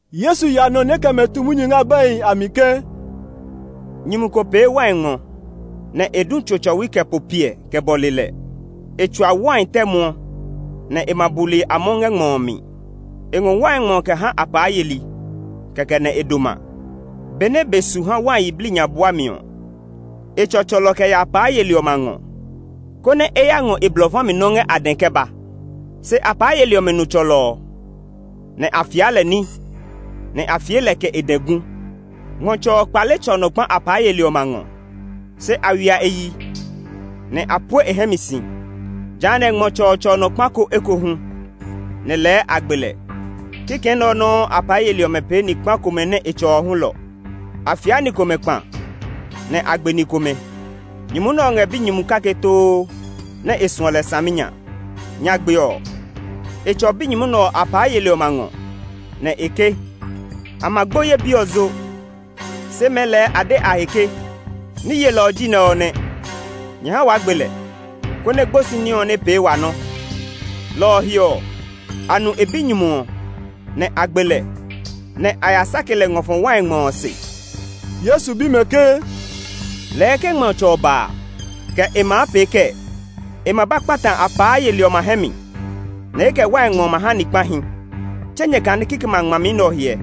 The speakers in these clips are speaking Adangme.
Yesu ya nɔ nɛ e kɛ mɛ tu munyu ngɛ abɛhi a mi ke, “Nyumu ko pee wai ngmɔ, nɛ e du tso tsɔwi kɛ po piɛ kɛ bɔle lɛ. E tsua wai tɛ muɔ, nɛ e ma buli a mɔ ngɛ ngmɔ ɔ mi. E ngɔ wai ngmɔ ɔ kɛ ha apaa yeli, kɛkɛ nɛ e doma. Benɛ be su ha wai yiblii nya buami ɔ, e tsɔ tsɔlɔ kɛ ya apaa yeli ɔmɛ a ngɔ, konɛ e ya ngɔ e blɔ fa mi nɔ́ ngɛ a dɛ kɛ ba. Se apaa yeli ɔmɛ nu tsɔlɔ ɔ, nɛ a fia lɛ ní, nɛ a fie lɛ kɛ e dɛ gu. Ngmɔtsɛ ɔ kpale tsɔ nɔ kpa apaa yeli ɔmɛ a ngɔ. Se a ywia e yi, nɛ a pue e hɛ mi si. Jehanɛ ngmɔtsɛ ɔ tsɔ nɔ kpa ko ekohu, nɛ lɛɛ a gbe lɛ. Kikɛ nɛ ɔ nɔuu apaa yeli ɔmɛ pee ni kpa komɛ nɛ e tsɔ ɔ hulɔ; a fiaa ni komɛ kpa, nɛ a gbe ni komɛ. Nyumu nɛ ɔ ngɛ binyumu kake too nɛ e suɔ lɛ saminya. Nyagbe ɔ, e tsɔ binyumu nɛ ɔ apaa yeli ɔmɛ a ngɔ, nɛ e ke, ‘A ma gbo ye bi ɔ zo.’ Se mɛɛ lɛɛ a de a he ke, ‘Ní yelɔ ɔ ji nɛ ɔ nɛ; nyɛ ha waa gbe lɛ, konɛ gbosi ní ɔ nɛ pee wa nɔ.’ Lɔ ɔ he ɔ, a nu e binyumu ɔ, nɛ a gbe lɛ, nɛ a ya sake lɛ ngɔ fɔ wai ngmɔ ɔ se.” Yesu bi mɛ ke, “Lɛɛ ke ngmɔtsɛ ɔ ba a, kɛ e maa pee kɛɛ? E ma ba kpata apaa yeli ɔmɛ a hɛ mi, nɛ e kɛ wai ngmɔ ɔ ma ha ni kpahi. Tse nyɛ kane kikɛmɛ a ngmami nɛ ɔ hyɛ?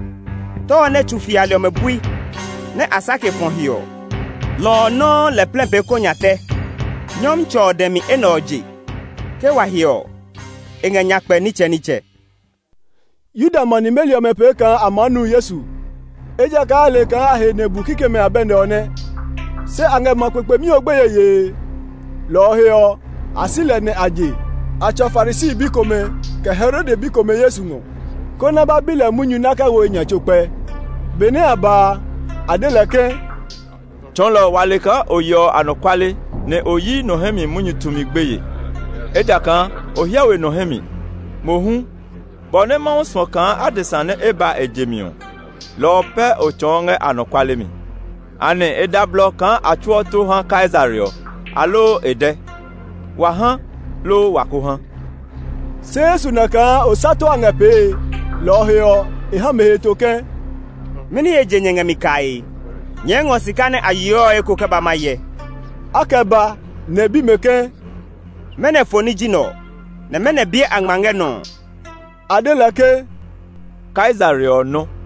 ‘Tɛ ɔ nɛ tsu fiali ɔmɛ bui, nɛ a sake fɔ he ɔ, lɔ ɔ nɔuu lɛ plɛ pee kɔ nya tɛ. Nyɔmtsɛ ɔ dɛ mi enɛ ɔ je; ke wa hyɛ ɔ, e ngɛ nyakpɛ nitsɛnitsɛ.’” Yuda ma nimeli ɔmɛ pee kaa a maa nu Yesu, ejakaa a le kaa a he nɛ e bu kikɛmɛ a abɛ nɛ ɔ nɛ. Se a ngɛ ma kpekpemi ɔ gbeye yee; lɔ ɔ he ɔ, a si lɛ nɛ a je. A tsɔ Farisi bi komɛ kɛ Herode bi komɛ Yesu ngɔ, konɛ a ba bi lɛ munyu nɛ a kɛ wo e nya tso kpɛ. Benɛ a ba a, a de lɛ ke, “Tsɔɔlɔ, wa le kaa o yeɔ anɔkuale, nɛ o yi nɔ hɛ mi munyu tumi gbeye, ejakaa o hyɛ we nɔ hɛ mi; mohu, bɔ nɛ Mawu suɔ kaa adesa nɛ ba e je mi ɔ, lɔ ɔ pɛ o tsɔɔ ngɛ anɔkuale mi. Anɛ e da blɔ kaa a tsuɔ tó haa Kaisare ɔ, aloo e dɛ? Wa ha, loo wa ko ha?” Se Yesu na kaa osato a ngɛ pee, lɔ ɔ he ɔ, e ha mɛ heto ke, “Mɛni he je nyɛ ngɛ mi kae? Nyɛɛ ngɔ sika nɛ a yeɔ ɔ eko kɛ ba ma hyɛ.” A kɛ ba; nɛ e bi mɛ ke, “Mɛnɔ foni ji nɛ ɔ, nɛ mɛnɔ biɛ a ngma ngɛ nɔ ɔ?” A de lɛ ke, “Kaisare ɔ nɔ.”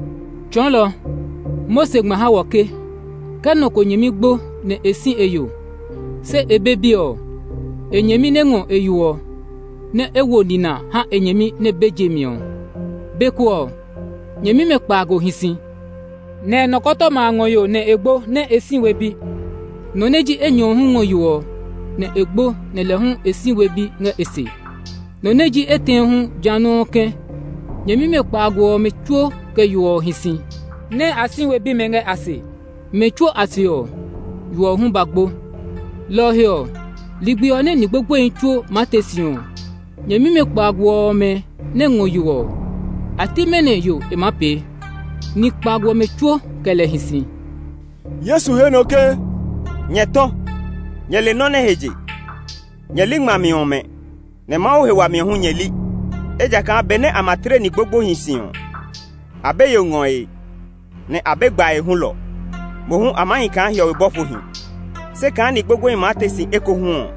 “Tsɔɔlɔ, Mose ngma ha wɔ ke, ‘Ke nɔ ko nyɛmi gbo nɛ e si e yo, se e be bi ɔ, e nyɛmi nɛ ngɔ e yo ɔ, nɛ e wo nina ha e nyɛmi nɛ be je mi ɔ.’ Be ko ɔ, nyɛmimɛ kpaago hi si, nɛ nɔkɔtɔma a ngɔ yo nɛ e gbo nɛ e si we bi. Nɔ nɛ ji enyɔ ɔ hu ngɔ yo ɔ, nɛ e gbo nɛ lɛ hu e si we bi ngɛ e se. Nɔ nɛ ji etɛ ɔ hu ja nɔuu kɛ̃. Nyɛmimɛ kpaago ɔmɛ tsuo kɛ yo ɔ hi si, nɛ a si we bimɛ ngɛ a se. Mɛ tsuo a se ɔ, yo ɔ hu ba gbo. Lɔ ɔ he ɔ, ligbi ɔ nɛ ni gbogboehi tsuo maa te si ɔ, nyɛmimɛ kpaago ɔmɛ nɛ ngɔ yo ɔ, a ti mɛnɔ yo e maa pee? Ni kpaago ɔmɛ tsuo kɛ lɛ hi si.” Yesu he nɔ ke, “Nyɛ tɔ! Nyɛ le nɔ nɛ he je? Nyɛ li ngmami ɔmɛ, nɛ Mawu he wami ɔ hu nyɛ li. Ejakaa benɛ a ma tle ni gbogboehi si ɔ, a be yo ngɔe, nɛ a be gbae hulɔ; mohu a maa hi kaa hiɔwe bɔfohi. Se kaa ni gbogboehi maa te si ekohu ɔ,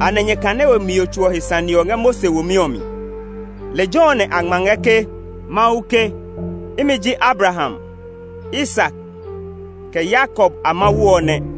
anɛ nyɛ kane we mio tso ɔ he sane ɔ ngɛ Mose womi ɔ mi? Lejɛ ɔ nɛ a ngma ngɛ ke Mose ke, ‘Imi ji Abraham, Isak, kɛ Yakob a Mawu ɔ nɛ.’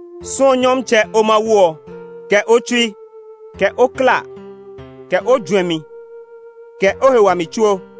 Suɔ Nyɔmtsɛ, o Mawu ɔ kɛ o tsui, kɛ o klaa, kɛ o juɛmi, kɛ o he wami tsuo!’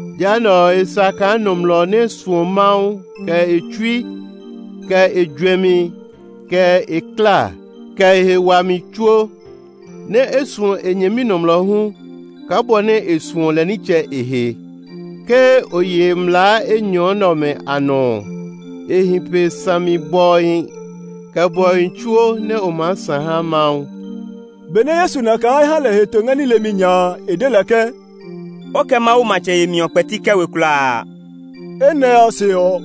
Jehanɛ, e sa kaa nɔmlɔ nɛ suɔ Mawu kɛ e tsui, kɛ e juɛmi, kɛ e klaa, kɛ e he wami tsuo, nɛ́ e suɔ e nyɛmi nɔmlɔ hu kaa bɔ nɛ e suɔ lɛ nitsɛ e he. Ke o ye mlaa enyɔ nɛ ɔmɛ a nɔ ɔ, e hi pe sami bɔhi, kɛ bɔhi tsuo nɛ o maa sã ha Mawu.” Benɛ Yesu na kaa e ha lɛ heto ngɛ ní lemi nya a, e de lɛ ke, “O kɛ Mawu matsɛ yemi ɔ kpɛti kɛ we kulaa.” Enɛ ɔ se ɔ,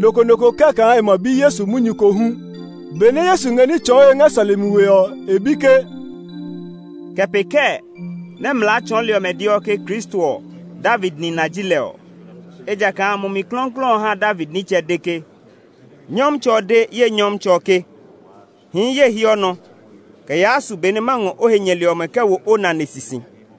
nɔ ko nɔ ko kɛ́ kaa e ma bi Yesu munyu ko hu. Mɛnɔ ji Kristo ɔ? Benɛ Yesu ngɛ ní tsɔɔe ngɛ sɔlemi we ɔ, e bi ke, “Kɛ pee kɛɛ nɛ mlaa tsɔɔli ɔmɛ deɔ ke Kristo ɔ David nina ji lɛ ɔ? Ejakaa Mumi Klɔuklɔu ha David nitsɛ de ke, ‘Nyɔmtsɛ ɔ de ye Nyɔmtsɛ ɔ ke, “Hii ye hiɔ nɔ kɛ yaa su be nɛ ma ngɔ o he nyɛli ɔmɛ kɛ wo o nane sisi.” ’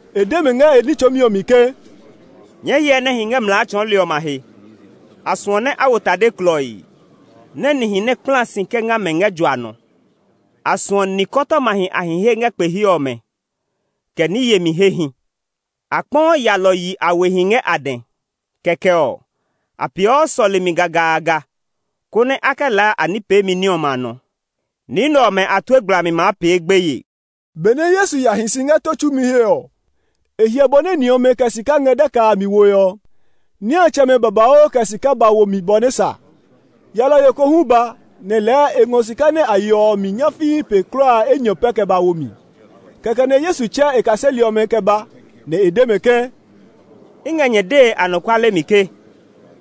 E de mɛ ngɛ e ní tsɔɔmi ɔ mi ke, “Nyɛɛ hyɛ nɛ hi ngɛ mlaa tsɔɔli ɔmɛ a he. A suɔ nɛ a wo tade klɔii, nɛ nihi nɛ kpla si kɛ nga mɛ ngɛ jua nɔ. A suɔ nikɔtɔmahi a hi he ngɛ kpe he ɔmɛ, kɛ ní yemi hehi. A kpɔɔ yalɔyi a wehi ngɛ a dɛ, kɛkɛ ɔ, a peeɔ sɔlemi gagaaga konɛ a kɛ laa a ní peemi ní ɔmɛ a nɔ. Ni nɛ ɔmɛ a tue gblami maa pee gbeye.” Benɛ Yesu ya hi si ngɛ tó tsumi he ɔ, e hyɛ bɔ nɛ ni ɔmɛ kɛ sika ngɛ daka a mi woe ɔ. Niatsɛmɛ babauu kɛ sika ba wo mi bɔ nɛ sa. Yalɔyo ko hu ba, nɛ lɛɛ e ngɔ sika nɛ a yeɔ ɔ mi nyafii pe kulaa enyɔ pɛ kɛ ba wo mi. Kɛkɛ nɛ Yesu tsɛ e kaseli ɔmɛ kɛ ba, nɛ e de mɛ ke, “I ngɛ nyɛ dee anɔkuale mi ke,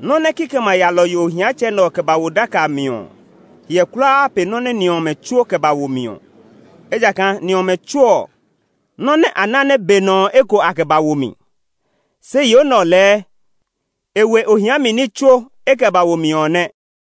nɔ́ nɛ kikɛmɛ a yalɔyo ohiatsɛ nɛ ɔ kɛ ba wo daka a mi ɔ hiɛ kulaa pe nɔ́ nɛ ni ɔmɛ tsuo kɛ ba wo mi ɔ. Ejakaa ni ɔmɛ tsuo ɔ, nɔ́ nɛ a ná nɛ be nɔ ɔ eko a kɛ ba wo mi, se yo nɛ ɔ lɛɛ e we ohia mi ní tsuo e kɛ ba wo mi ɔ nɛ.”